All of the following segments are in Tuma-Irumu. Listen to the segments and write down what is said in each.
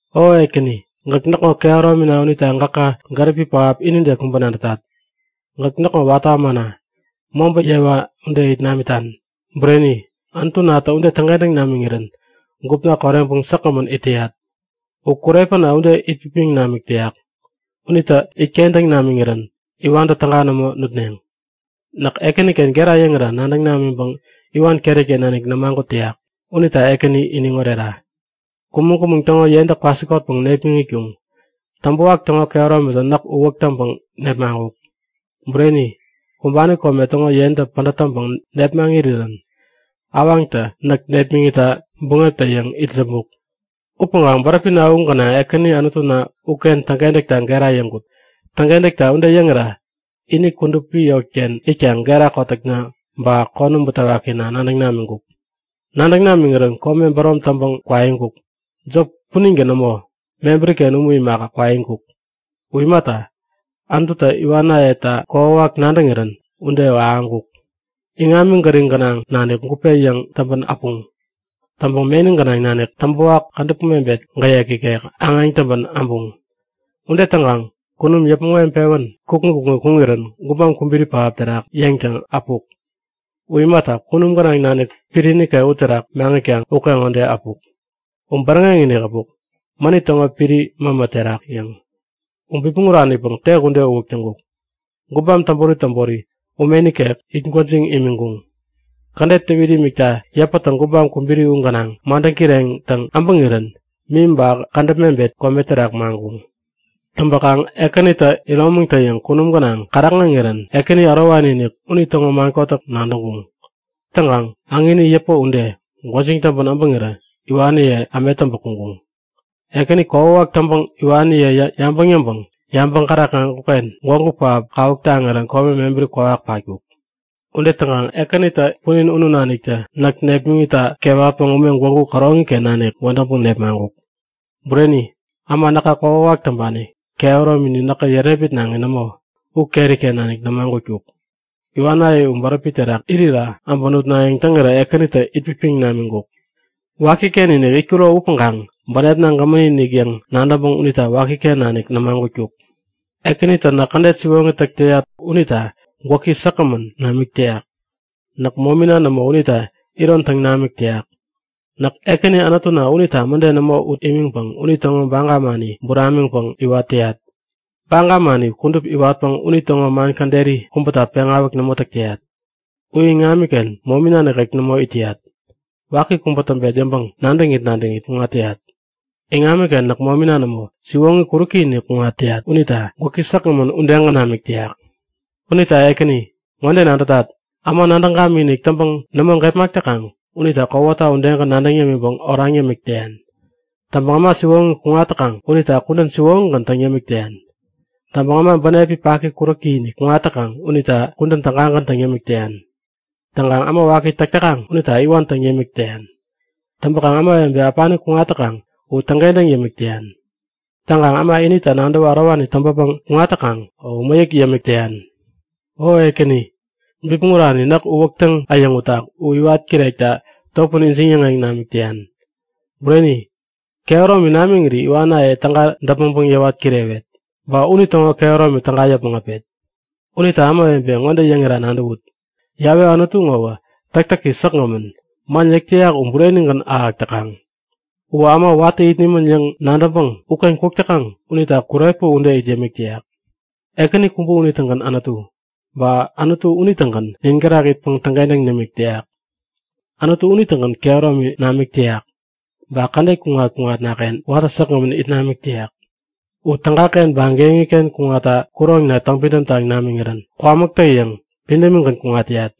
O Ekäni, gäk näkŋo kehäromina unita gäka gäripi pähap inide kubä nadätat! Gäk näkŋo watä ämana, mobä yewa ude it namitan. Bureni, Anutunatä ude täŋkentäŋ namiŋirän gupna koreŋpäŋ säkgämän it täyat. U kurepä ude itpipiŋ namik täyak. Unitä itkentäŋ namiŋirän iwantä täga nämo nutneŋ. Näk Ekäniken gera yäŋira nadäŋ namiŋpäŋ iwan keriken nanik nämagut täyak. Unita Ekäni iniŋ orera! Kumäŋ-kumäŋ täŋo yentä kwasikotpäŋ nepmaŋkuŋ. Täŋpäwak täŋo kehäromitä näk uwäk taŋpäŋ nepmaŋkuk. Bureni, kumbani kome täŋo yentä pädät täŋpäŋ nepmäŋ irirän awaŋtä näk nepmäŋitta buŋeptä-yäŋ itsämbuk. Upäŋkaŋ bäräpina u gänaŋ Ekäni Anutuna uken täŋkentäkta gera yäŋkut. Täŋkentäkta ude yäŋira ini kudupi yotken itkaŋ gera kotäkna ba konäm butewakina nadäŋ namiŋkuk. Nadäŋ namiŋirän kome bärom täŋpäŋ kwaiŋkuk. Jop puningän nämo, mebäriken umu imaka, kwaiŋkuk. U imata, Anututä iwanayeta kokwawak nadäŋirän ude uwä ahäŋkuk. Iŋami gäriŋ gänaŋ nanik gupe yäŋ täŋpän äpuŋ. Täŋpäŋ meni gänaŋ nanik täŋpäwak kädäp mebet gäyek ikek aŋeŋ täŋpän abuŋ. Ude täŋkaŋ kunum yäpmäŋ weŋpewän kukŋi kukŋi kuŋirän gubam kubiri pähap terak yeŋtäŋ äpuk. U imaka kunum gänaŋ nanik piri nikek uterak maŋitkaŋ ukeŋode äpuk. U bäräŋek-inik äpuk, mänit täŋo piri mämä terak yäŋ. U bipmäŋ uranipäŋ tek ude uwäk täŋkuk. Gubam tobori tobori ume nikek it gwäjiŋ imiŋkuŋ. Kädet täwit imikta yäpätä gubam kubiri u gänaŋ madäŋ kireŋtäŋ äbäŋirän mim ba kädäp mebet kome terak maŋkuŋ. Täŋpäkaŋ Ekänitä iromaŋtä-yäŋ kunum gänaŋ kärakŋeŋirän Ekäni Ärowani-inik unitäŋo man kotäk nadäŋkuŋ. Täŋkaŋ äŋini yäpä ude, gwäjiŋ täŋpän äbäŋirä iwaniye ämet täŋpä kuŋkuŋ. Ekäni kokwawak täŋpäŋ iwaniye yabäŋ yäŋpäŋ yabäŋ kärakŋeŋkuk-ken gwägu pähap kawuk taŋirän kome mebäri kwawak patkuk. Ude täŋpäŋ Ekänitä punin unu naniktä näk nepmäŋitta kewatpäŋ ume gwägu käroŋiken nanik wädäŋpäŋ nepmaŋkuk. Bureni, äma näka kokwawak täŋpani, kehäromini näkä yärepmitnaŋi nämo u keriken nanik nämagutkuk. Iwanaye u bäräpi terak irira äbä nutnayäŋ täŋirä Ekänitä itpipiŋ namiŋkuk. Wakiken-inik itkuro upäŋkaŋ bänepna gämäni-inik yäŋ nadäŋpäŋ unita wakiken nanik nämagutkuk. Ekänitä näk kädet siwoŋi täk täyat unita gwäki säkgämän namik täyak. Näk momina nämo unita iron täŋ namik täyak. Näk Ekäni Anutuna unita mäde nämo ut imiŋpäŋ unitäŋo baga mani buramiŋpäŋ iwat täyat. Baga mani kudup iwatpäŋ unitäŋo man käderi kubäta peŋawäk nämo täk täyat. U iŋamiken momina nikek nämo it täyat. Waki kubä täŋpet yäŋpäŋ nadäŋit nadäŋit kuŋat täyat. Iŋamiken näk momina nämo, siwoŋi kuräki-inik kuŋat täyat unita gwäki säkgämän udegän namik täyak. Unita Ekäni, ŋode nadätat; Äma nadäŋ gamikinik täŋpäŋ nämo gepmak täkaŋ unita kowata udegän nadäŋ yämiŋpäŋ oraŋ yämik täyan. Täŋpäŋ äma siwoŋi kuŋat täkaŋ unita kudän siwoŋigän täŋ yämik täyan. Täŋpäŋ äma bänep paki kuräki-inik kuŋat täkaŋ unita kudän tägagän täŋ yämik täyan. Täŋkaŋ äma waki täk täkaŋ unita iwan täŋ yämik täyan. Täŋpäkaŋ ämawebe äpani kuŋat täkaŋ u täŋkentäŋ yämik täyan. Täŋkaŋ äma inita nadäwä ärowani täŋpäpäŋ kuŋat täkaŋ u mäyäk yämik täyan. O Ekäni, bipmäŋ urani näk uwäktäŋ äyäŋutak u iwat kirekta topän ijiŋ-yäŋeŋ namik täyan. Bureni, kehäromi namiŋiri iwanaye täga däpmäŋpäŋ yäwat kirewet. Ba unitäŋo kehäromi täga yäpmäŋ äpet. Unita ämawebe, ŋode yäŋira nadäwut; Yawe Anutu ŋowä täktäki säkgämän, man yäk täyak u burenigän ahäk täkaŋ. Uwä äma watä it nimän yäŋ nadäŋpäŋ uken kuk täkaŋ unita kurepä ude it yämik täyak. Ekäni kubä unitägän Anutu. Ba Anutu unitägän nin gärak itpäŋ täŋkentäŋ nimik täyak. Anutu unitägän kehäromi namik täyak, ba kädet kuŋat-kuŋatnaken watä säkgämän it namik täyak. U tägaken ba geŋiken kuŋatta kuroŋna täŋpidäm taŋ namiŋirän kwamäktä-yäŋ pidämigän kuŋat täyat.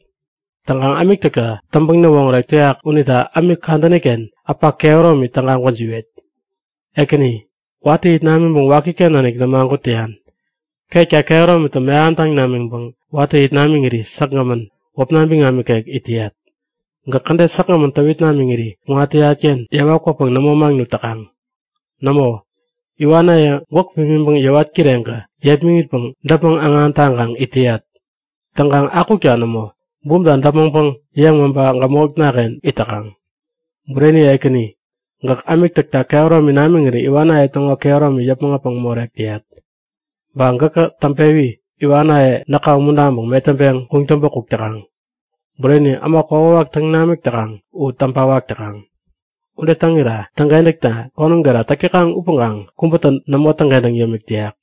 Täŋkaŋ ämik täkta täŋpäŋ-näwoŋärek täyak unita ämik kadäniken äpa kehäromi täga gwäjiwet. Ekäni, watä it namiŋpäŋ wakiken nanik nämagut täyan. Ketka kehäromitä mehamtäŋ namiŋpäŋ watä it namiŋiri säkgämän, wäpna biŋam nikek it täyat. Gäk kädet säkgämän täwit namiŋiri kuŋat täyatken yewa kwäpäŋ nämo maŋnut täkaŋ. Nämo, iwanaye gwäk pimiŋpäŋ yäwat kireŋkä yepmäŋitpäŋ däpmäŋ-äŋan täŋkaŋ it täyat. Täŋkaŋ akukta nämo, bumta däpmäŋpäŋ yepmaŋpa gämotnaken it täkaŋ. Bureni Ekäni, gäk ämik täkta kehäromi namiŋiri iwanaye täŋo kehäromi yäpmäŋ äpäŋ morek täyat. Ba gäkä täŋpewi iwanaye näka umuntaŋpäŋ metäŋpeŋ kuŋtäŋpä kuk täkaŋ. Bureni, äma kokwawak täŋ namik täkaŋ u täŋpawak täkaŋ. Ude täŋira täŋkentäkta konäm gera täk täkaŋ upäŋkaŋ kubätä nämo täŋkentäŋ yämik täyak.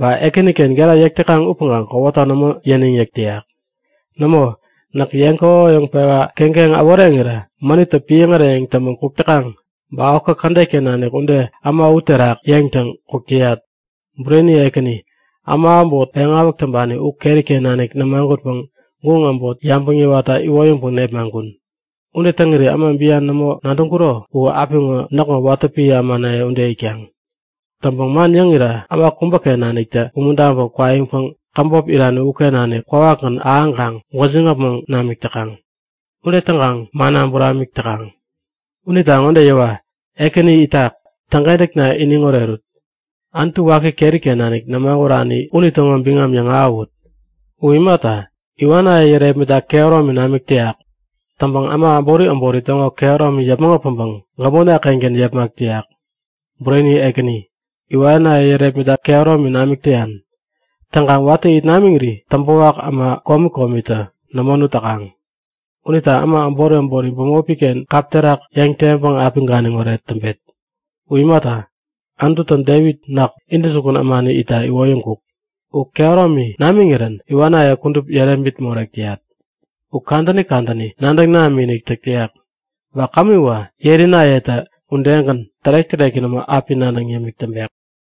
Ba Ekäniken gera yäk täkaŋ upäŋkaŋ kowata nämo yäniŋ-yäk täyak. Nämo, näk yeŋ kokoyäŋ-pewa keŋkeŋ äworeŋirä mänittä piäŋ äreyäŋ täŋpän kuk täkaŋ. Ba okä kädetken nanik ude äma u terak yeŋtäŋ kuk täyat. Bureni Ekäni, äma äbot peŋawäk täŋpani u keriken nanik nämagutpäŋ guŋ äbot yabäŋ yäwatta iwoyäŋpäŋ nepmaŋkun. Ude täŋiri äma bian nämo nadäŋkuro u apiŋo näkŋo watä piä ämanaye ude itkaŋ. Täŋpäŋ man yäŋira äma kubäken naniktä umuntaŋpäŋ kwaiŋkaŋ käbop irani uken nanik kwawakgän ahäŋkaŋ gwäjiŋ äpmoŋ namik täkaŋ. Ude täŋkaŋ manna buramik täkaŋ. Unita ŋode yäwa; Ekäni itak! Täŋkentäkna iniŋ orerut! Anutu waki keriken nanik nämagurani unitäŋo biŋam yäŋahäwut! U imata, iwanaye yärepmitta kehäromi namik täyak. Täŋpäŋ äma äbori äbori täŋo kehäromi yäpmäŋ äpäŋpäŋ gämotna-kengän yepmak täyak. Bureni Ekäni, iwanaye yärepmitta kehäromi namik täyan. Täŋkaŋ watä it namiŋiri täŋpäwak äma komi komitä nämo nut täkaŋ. Unita äma äbori äbori bämopiken kap terak yäŋ-teŋpäŋ api ganiŋoret täŋpet. U imata, Anututä Devit näk, intäjukun ämani itta iwoyäŋkuk. U kehäromi namiŋirän iwanaye kudup yärepmit morek täyat. U kadäni kadäni nadäŋ namikinik täk täyak. Ba kämiwä yerinayeta udegän tärek-täreki nämo api nadäŋ yämik täŋpek.